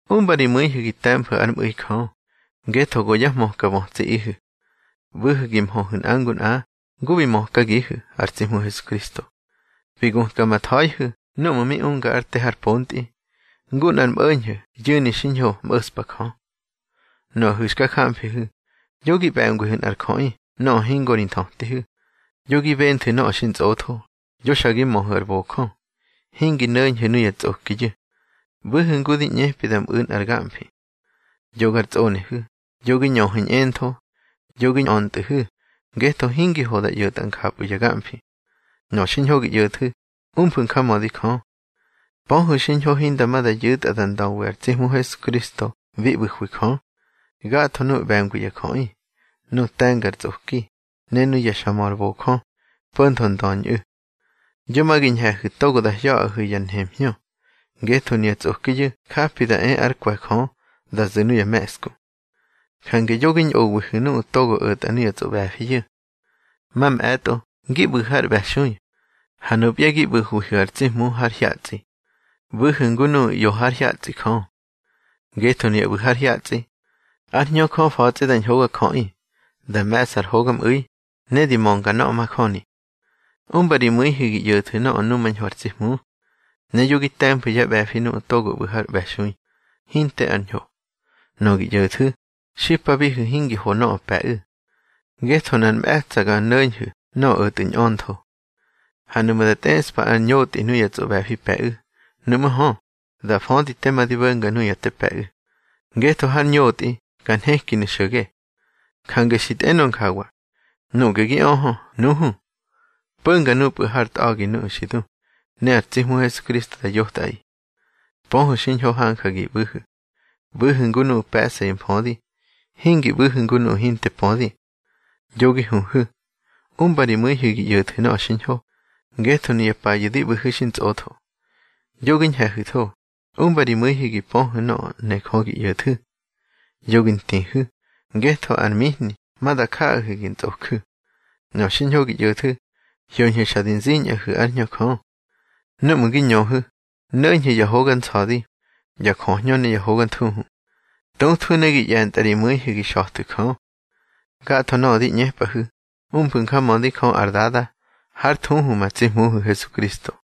Umba ri mu̱ihu̱ gi te̱mfu̱ ár mꞌu̱i Jö, ngetho go yá hmöka bötsiꞌihu̱. ꞌBu̱hu̱ gi mhöhu̱ nꞌa ngu nꞌa ngu bi mökagihu̱ ar tsi Hmu Hesukristo. Bi gutka ma tha̱ihu̱ núꞌmu̱ mi unga ár te har pontꞌi, ngu nꞌar mꞌo̱ñho̱ yu̱ni xiñho mꞌo̱ꞌspa Jö. Nuꞌu̱ xka jamfihu̱, yo gi ꞌbe̱ngwihu̱ nꞌar jöꞌi nöꞌö hingo ri nthötihu̱, yo gi benthu̱ nöꞌö xintsꞌotho, yo xa gi möhu̱ ar bojö, hingi no̱ñhu̱ nuya tsꞌokiyu̱. ꞌBu̱hu̱ ngu di ꞌñepi da mꞌu̱ nꞌar gamfi. Yo gar tsꞌonehu̱, yo gi ñöhu̱ ñꞌentho, yo gi ñꞌöntꞌu̱hu̱, ngetho hingi ho da ꞌyo̱tꞌa njapꞌu̱ ya gamfi. Nöꞌö xiñho gi ꞌyo̱thu̱, umfu̱ njamödi Jö. Pöhu̱ xiñho hinda ma da yu̱tꞌa da ndöwi ar tsi Hmu Hesukristo bi ꞌbu̱hwi Jö, gatho nuꞌu̱ ꞌbe̱ngwi ya jöꞌi, nuꞌu̱ te̱nga ar tsꞌoki, ne nuꞌu̱ xa mö ar bojö, po̱ntho ndöñꞌu̱. Yo ma gi ñhe̱hu̱ togo da hya̱ꞌahu̱ ya nemhñö, ngetho nuya tsꞌokiyu̱ japi da e ár kwe̱ Jö da zu̱ nuya me̱ꞌsku. Jange yo gi ñꞌowihu̱ nuꞌu̱ togo o̱tꞌa nuya tsꞌoꞌbe̱fiyu̱. Mamꞌe̱tꞌo ngi ꞌbu̱hu̱ har ꞌbe̱xui, ha nupya gi ꞌbu̱hwihu̱ ar tsi Hmu har hyatsꞌi. ꞌBu̱hu̱ ngu nuꞌu̱ ꞌyo hár hyatsꞌi Jö. Ngetho nuya ꞌbu̱ har hyatsꞌi, ár Hñö Jö fa̱tsꞌi da ñhogajöꞌi, da me̱ꞌsa ar hogamꞌu̱i, ne di mönga nöꞌö majöni. Umba ri mu̱ihu̱ gi ꞌyo̱thu̱ nöꞌö numañho ar tsi Hmu. Ne yo gi te̱mfu̱ yá ꞌbe̱fi nuꞌu̱ togo ꞌbu̱ har ꞌbe̱xui, hinte ár ñho. Nöꞌö gi ꞌyo̱thu̱, xipabihu̱ hingi ho nöꞌö pe̱ꞌu̱. Ngetho nꞌar mꞌe̱tsa̱ ga no̱ñhu̱ nöꞌö o̱tꞌu̱ ñꞌöntho. Ha nuꞌmu̱ da tꞌeꞌspa ar ñotꞌi nuya tsꞌoꞌbe̱fi pe̱ꞌu̱, nuꞌmú̱ hö, da födi tema di bo̱nga nuya te pe̱ꞌu̱, ngetho har ñotꞌi ka nhekinu̱ xo̱ge. Jange xi tꞌenö njawa: Nuꞌge gi öhö, nuhu, po̱nga nupꞌu̱ hár tꞌa̱gi nuꞌu̱ xi du, ne ar tsi Hmu Hesukristo da yotꞌaꞌi. Pöhu̱ xiñho hanja gi ꞌbu̱hu̱. ꞌBu̱hu̱ ngu nuꞌu̱ pe̱ꞌsa yá mfödi, hingi ꞌbu̱hu̱ ngu nuꞌu̱ hinte pödi. Yo gi huhu̱, umba ri mu̱ihu̱ gi ꞌyo̱thu̱ nöꞌö xiñho, ngetho nuya payu̱ di ꞌbu̱hu̱ xintsꞌotho. Yo gi ñhe̱hu̱tho, umba ri mu̱ihu̱ gi pöhu̱ nöꞌö ne Jö gi ꞌyo̱thu̱. Yo gi ntihu̱, ngetho ar mihni ma da jaꞌahu̱ gi ntsꞌoju̱. Nöꞌö xiñho gi ꞌyo̱thu̱, hyoñhu̱ xa di ziñꞌahu̱ ár Hñö Jö. Núꞌmu̱ gi ñöhu̱, no̱ñhu̱ ya hoga nsa̱di, ya jöhñö ne ya hoga thuhu. Tuthwu̱ ne gi ꞌye̱ntꞌa ri mu̱ihu̱ gi xa̱thu̱ Jö. Gatho nöꞌö di ꞌñepꞌahu̱, umfu̱ njamödi Jö ar Dada hár thuhu ma tsi Hmuhu̱ Hesukristo.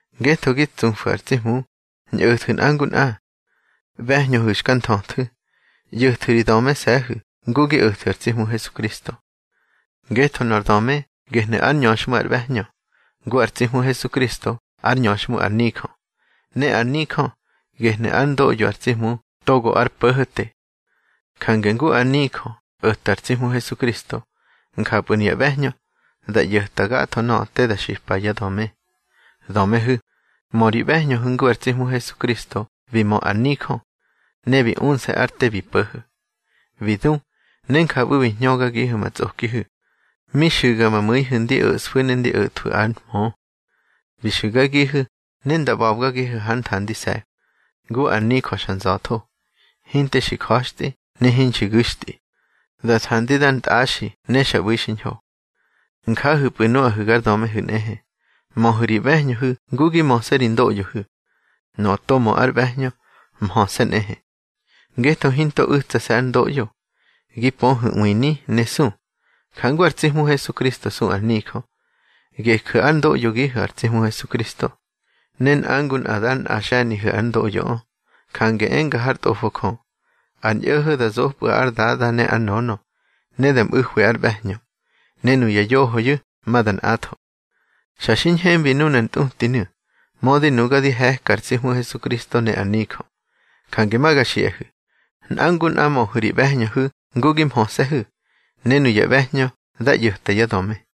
Ngetho gi tsufu̱ ar tsi Hmu, ñꞌo̱thu̱ nꞌa ngu nꞌa. ꞌBe̱hñöhu̱ xka nthöthu̱, ꞌyo̱thu̱ ri dömese̱hu̱ ngu gi o̱thu̱ ar tsi Hmu Hesukristo. Ngetho ar döme gehnu̱ ár ñöxhmu ar ꞌbe̱hñö, ngu ar tsi Hmu Hesukristo ár ñöxhmu ar nijö, ne ar nijö gehnu̱ ár ndoꞌyo ar tsi Hmu togo ár Po̱ho̱te. Jange ngu ar nijö o̱ta ar tsi Hmu Hesukristo, njapꞌu̱ nuya ꞌbe̱hñö da ꞌyo̱tꞌa gatho nöꞌö te da xipa yá döme. Dömehu̱, mö ri ꞌbe̱hñöhu̱ ngu ar tsi Hmu Hesukristo bi mö ár nijö, ne bi unse̱ ár te bi po̱ho̱. Bi du, ne njapꞌu̱ bi hñögagihu̱ ma tsꞌokihu̱, mi xu̱ga ma mu̱ihu̱ ndi o̱ꞌsfu̱ ne ndi o̱thwu̱ ár mhö. Bi xu̱gagihu̱ ne nda ꞌba̱bgagihu̱ hár nthandise̱ ngu ár nijö xa nza̱tho, hinte xi ja̱xtꞌi ne hinxi gu̱xtꞌi, da thandi dar ntꞌaxi ne xa ꞌbu̱i xiñho. Njahu̱pꞌu̱ nuꞌahu̱ gar dömehu̱ nꞌehe, möhu̱ ri ꞌbe̱hñöhu̱ ngu gi möse̱ ri ndoꞌyohu̱. Nöꞌö to mö ár ꞌbe̱hñö, mhöse̱ nꞌehe. Ngetho hinto u̱tsase̱ ár ndoꞌyo, gi pöhu̱ ꞌwini ne su, jangu ar tsi Hmu Hesukristo su ar nijö. Geju̱ ár ndoꞌyogihu̱ ar tsi Hmu Hesukristo, ne nꞌa ngu nꞌa dar nꞌa xe̱nigihu̱ ár ndoꞌyoꞌö. Jange enga hár Tꞌofo Jö, ar ñꞌo̱ho̱ da zopꞌu̱ ár dada ne ár nönö, ne da mꞌu̱hwi ár ꞌbe̱hñö, ne nuya yohoyu̱ ma da nꞌatho. Xa xi ñhembi nunar ntꞌutinu̱, mödi nuga di he̱ka ar tsi Hmu Hesukristo ne ár nijö. Jange ma ga xiꞌahu̱: Nꞌa ngu nꞌa möhu̱ ri ꞌbe̱hñöhu̱ ngu gi mhöse̱hu̱, ne nuya ꞌbe̱hñö dá ꞌyo̱ta yá döme.